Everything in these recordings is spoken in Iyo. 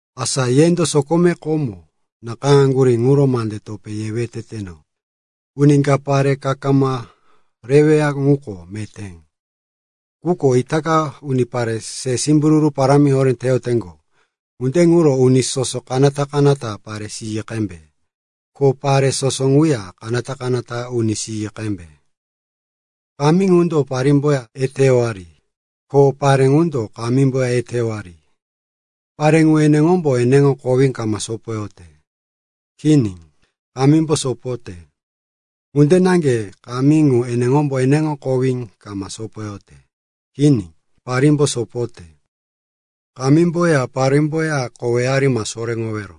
Asa yendo sokomeko komo nakayáŋaŋgurí ŋuro mande topé yewe teteno. Uni ka pare kama reweya ŋuko meté. Quko itaka unipare se simbururu parámi horé teyoteŋgo, ŋunde ŋuro uni soso kanata-kanata pare siyi qembe, ko pare soso ŋuya kanata-kanata uni siyi qembe. Kamí ŋundo parímboya eteyowari, ko pare ŋundo kamímboya eteyowari. Pare ŋu eneŋombo eneŋo kowí kama sopoyote. Kini, kamímbo sopoyote. Ŋunde naŋge kamí ŋu eneŋombo eneŋo kowí kama sopoyote. Kini, parímbo sopoyote. Kamímboya parímboya koweyari ma soréŋowero.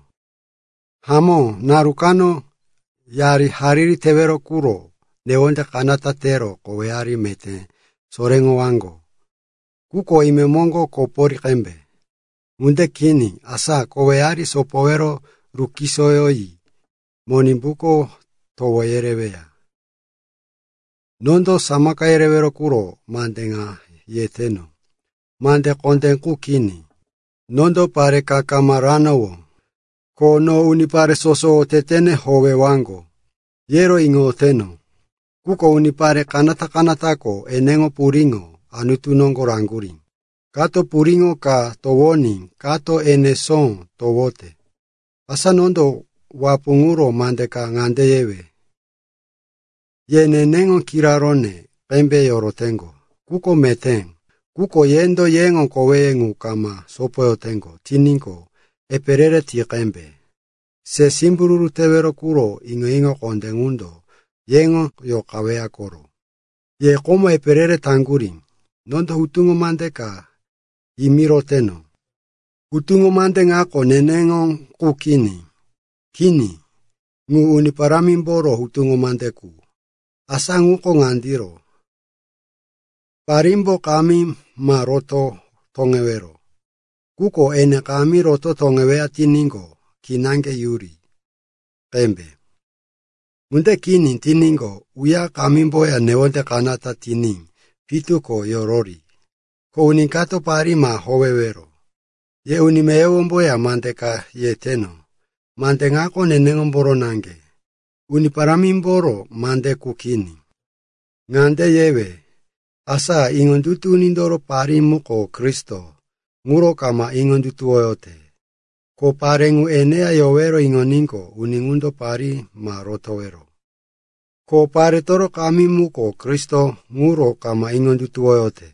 Hamó naru kano, yari hariri tewero quro newonde kanata tero koweyari meté soréŋowaŋgo. Quko imemoŋgo kopori qembe. Ŋunde kini asa koweyari sopowero rukusuwoyi Monimbuko towo yereweya. Nondo samaka yerewero quro mande ŋa yeteno. Mande kondé qu kini. Nondo pare ka kama ranowó, ko no unipare soso otetene howewaŋgo, yero iŋoyoteno. Quko unipare kanata-kanatako eneŋo puriŋo Anutu noŋgo raŋgurí; kato puriŋo ka towoní kato enesó towote. Asa nondo wapu ŋuro mande ka ŋande yewe. Ye neneŋo kiraróne qembe yoroteŋgo ŋuko meté. Quko yendo yeŋo koweye ŋu kama sopoyoteŋgo tiníqo, epe re-re ti qembe. Se simbururu tewero quro iŋo-iŋo kondé ŋundo yeŋo yoqaweya koro. Ye komo epe re-re taŋgurí, nondo hutuŋo mande ka yimiroteno. (Hutuŋo mande ŋako neneŋo qu kini. Kini, ŋu Uni Parámimboro hutuŋo mande qu.) Asa ŋuko ŋandiro: parímbo kamí ma roto toŋewero. Quko ene kamí roto toŋeweya tiníqo, kinaŋge yuri qembe. Ŋunde kini tiníqo, uya kamímboya newonde kanata tiní pitu ko yorori. Ko uni kato parí ma howewero. Ye uni meyowomboya mande ka yeteno. Mande ŋako neneŋomboro naŋge, Uni Parámimboro mande qu kini. Ŋande yewe, asa iŋondutu unindoro parí muko Kristo ŋuro kama iŋondutuwoyote, ko pare ŋu eneya yorowero iŋoníqo, uni ŋundo parí ma rotowero. Ko paretoro kamí muko Kristo ŋuro kama iŋondutuwoyote,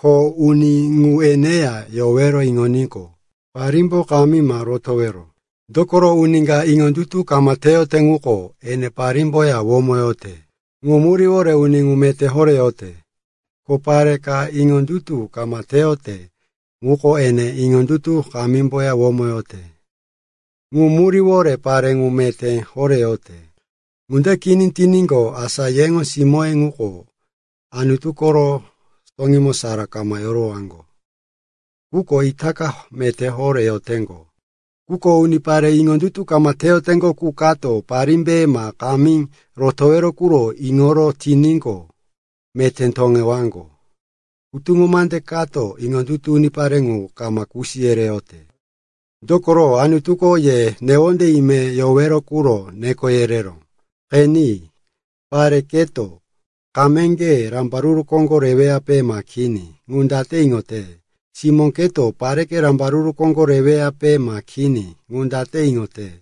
ko uni ŋu eneya yorowero iŋoníqo, parímbo kamí ma rotowero. Dokoro, uni ka iŋondutu kama teyote ŋuko ene parímboya womoyote, ŋu muríwore uni ŋu meté horé yote. Ko pare ka iŋondutu kama teyote ŋuko ene iŋondutu kamímboya womoyote, ŋu muríwore pare ŋu meté horé yote. Ŋunde kini tiníqo, asa yeŋo simóye ŋuko Anutu koro toŋímo sara kama yorowaŋgo. Quko itaka meté horé yoteŋgo. Quko unipare iŋondutu kama teyoteŋgo qu kato parímbe ma kamí rotowero quro iŋoro tiníqo, meté toŋewaŋgo. Hutuŋo mande kato iŋondutu unipare ŋu kama kusi yereyote. Dokoro, Anutuko ye newonde imemo yowero quro neko yereró. Qeni. Pare, keto kameŋge rambaruru koŋgo reweyape ma kini, ŋu date iŋote? Simó, keto pareke rambaruru koŋgo reweyape ma kini, ŋu date iŋote?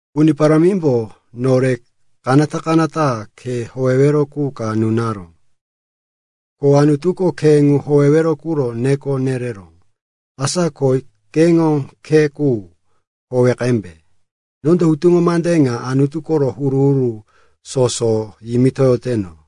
Uni Parámimbo nore kanata-kanata khe howewero qu ka nunaró, ko Anutuko khe ŋu howewero quro neko nereró. Asa ko keŋo khe qu howe qembe. Nondo hutuŋo mande ŋa Anutu koro huru-huru soso yimitoyoteno.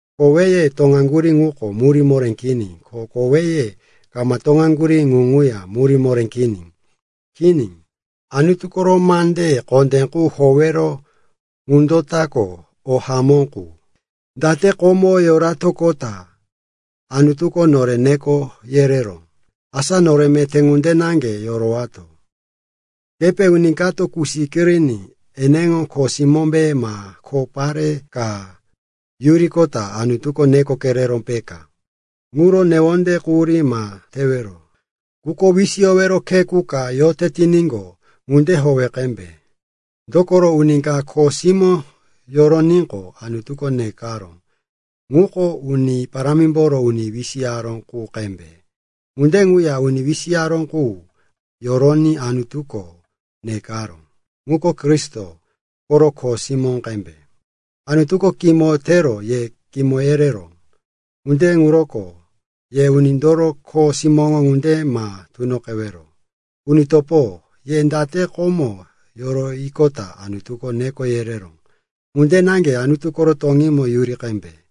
Koweye toŋaŋgurí ŋuko murí moré kini, ko koweye kama toŋaŋgurí ŋu ŋuya murí moré kini. Kini, Anutu koro mande kondé qu howewero ŋundo tako o hamó qu. Date komo yoratoqota Anutuko nore neko yereró, asa nore meté ŋunde naŋge yorowato. Kepe uni kato kusi kiriní eneŋo kho simómbe ma kho pare ka yuriqota Anutuko neko kereró, peka? Ŋuro newonde quhurí ma tewero. Quko wisiyowero khe qu ka yote tiníqo, ŋunde howe qembe. Dokoro uni ka kho simó yoroníqo, Anutuko nekaró, ŋuko Uni Parámimboro uni wisiyaró qu qembe. Ŋunde ŋuya uni wisiyaró qu yoroní Anutuko nekaró, ŋuko Kristo koro kho simó qembe. Anutuko kimo tero ye kimo yereró, ŋunde ŋuroko ye unindoro kho simóŋo ŋunde ma tunoqewero. Uni topo, ye date komo yuriqota Anutuko neko yereró, ŋunde naŋge Anutu koro toŋímo yuri qembe.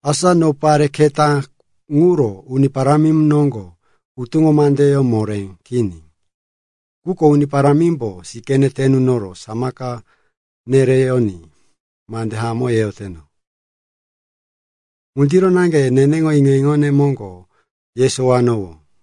Asa no pare keta ŋuro Uni Parámi noŋgo hutuŋo mandeyó moré kini. Quko Uni Parámimbo sikíne te nunoro samaka nereyoní mande hamó yeyoteno. Ŋundiro naŋge neneŋo iŋo-iŋone moŋgo yesowowano.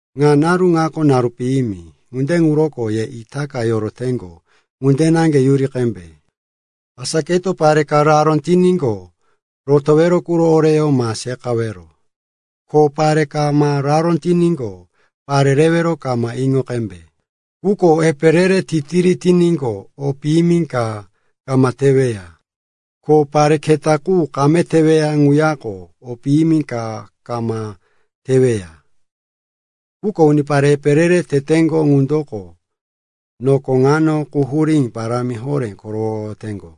Ŋa naru ŋako naru piyimi, ŋunde ŋuroko ye itaka yoroteŋgo ŋunde naŋge yuri qembe. Asa keto pare ka raró tiníqo, rotowero quro oreyó ma seqawero. Ko pare kama raró tiníqo, pare rewero kama iŋo qembe. Quko epe re-re titiri tiníqo, o piyimi ka kama teweya. Ko pare keta qu kame teweya ŋuyako o piyimi ka kama teweya. Quko unipare epe re-re teteŋgo ŋundo noko ŋano quhurí parámi horé korowoyoteŋgo.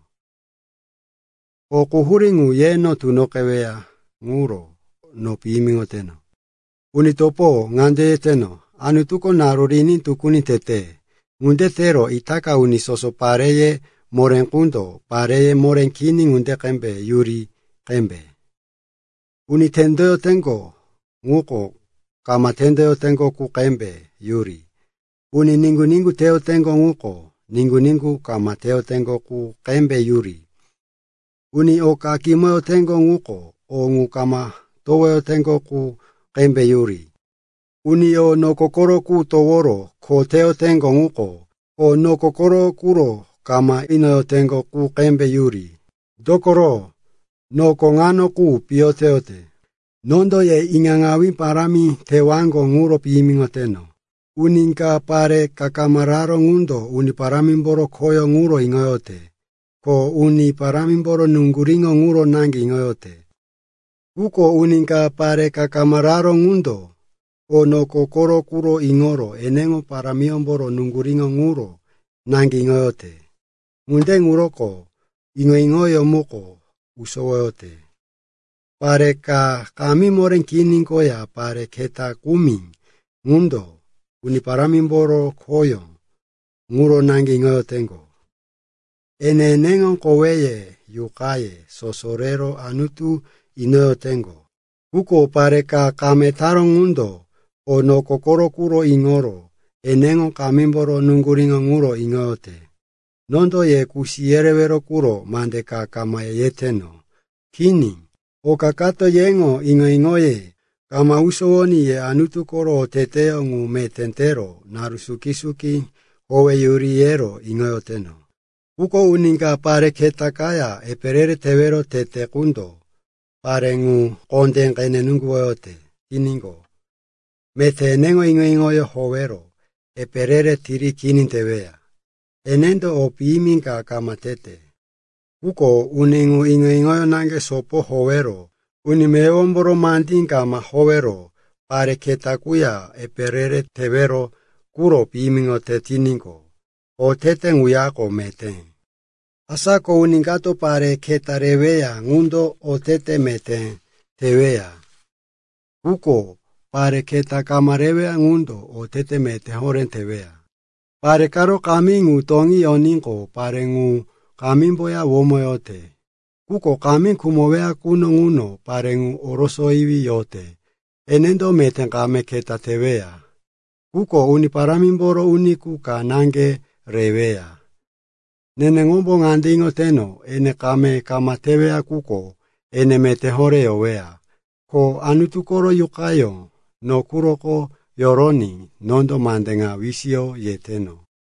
O quhurí ŋu yeno tunoqeyoweya ŋuro no piyimiŋoteno. Uni topo, ŋande yeteno, Anutuko naru riní tukuni tete. Ŋunde tero itaka uni soso pareye moré qundo pareye moré kini ŋunde qembe yuri qembe. Uni tendoyoteŋgo ŋuko kama tendoyoteŋgo qu qembe yuri. Uni niŋgu-niŋgu teyoteŋgo ŋuko niŋgu-niŋgu kama teyoteŋgo qu qembe yuri. Uni oka kimoyoteŋgo ŋuko o ŋu kama towowaŋgo qu qembe yuri. Uni o noko koro qu toworo kho teyoteŋgo ŋuko o noko koro quro kama iŋo inoyoteŋgo qu qembe yuri. Dokoro noko ŋano qu piyo teyate. Nondo ye iŋaŋawí parámi tewaŋgo ŋuro piyimiŋoteno. Uni ka pare kama raró ŋundo Uni Parámimboro khoyó ŋuro iŋoyote. Ko Uni Parámimboro nuŋguríŋo ŋuro naŋge iŋoyote. Quko uni ka pare raró ŋundo o noko koro quro iŋoro eneŋo parímboro nuŋguríŋo ŋuro naŋge iŋoyote. Ŋunde ŋuroko iŋo-iŋoyó muko usowote. Pare ka kamí moré kini koya pare keta kumi ŋundo Uni Parámimboro khoyó ŋuro naŋge iŋoyoteŋgo. Ene eneŋo koweye yuqaye soso rero Anutu inoyoteŋgo. Quko pare ka kame taró ŋundo o noko koro quro iŋoro eneŋo kamímboro nuŋguríŋo ŋuro iŋoyote. Nondo ye kusi yerewero quro mande ka kama yeteno. Kini, oka kato yeŋo iŋo-iŋoye kama usowoní ye Anutu koro oteteyó ŋu meté tero naru suki-suki howeyuri, yero iŋoteno. Quko uni ka pare keta kaya epe re-re tewero tete qundo pare ŋu kondé qene nuŋguwoyote tiníqo, meté eneŋo iŋo-iŋoyó howero epe re-re tiri kini teweya. Enendo o piyimi ka kama tete. Quko uni ŋu iŋo-iŋoyó naŋge sopo howero uni meyowomboro mandí kama howero pare keta quya epe re-re tewero quro piyimiŋoyote tiníqo, otete ŋuyako meté. Asa ko uni kato pare keta reweya ŋundo otete meté teweya, quko pare keta kama reweya ŋundo otete meté horé teweya. Pare karo kamí ŋu toŋí yoníqo, pare ŋu kamímboya womoyote. Quko kamí khumoweya quno ŋuno pare ŋu orosoyiwí yote. Enendo meté kame keta teweya, quko Uni Parámimboro uni qu ka naŋge reweya. Neneŋombo ŋande iŋoteno, ene kame kama teweya quko ene meté horé yoweya. Ko Anutu koro Yuqayó no quroko yoroní nondo mande ŋa wisiyo yeteno.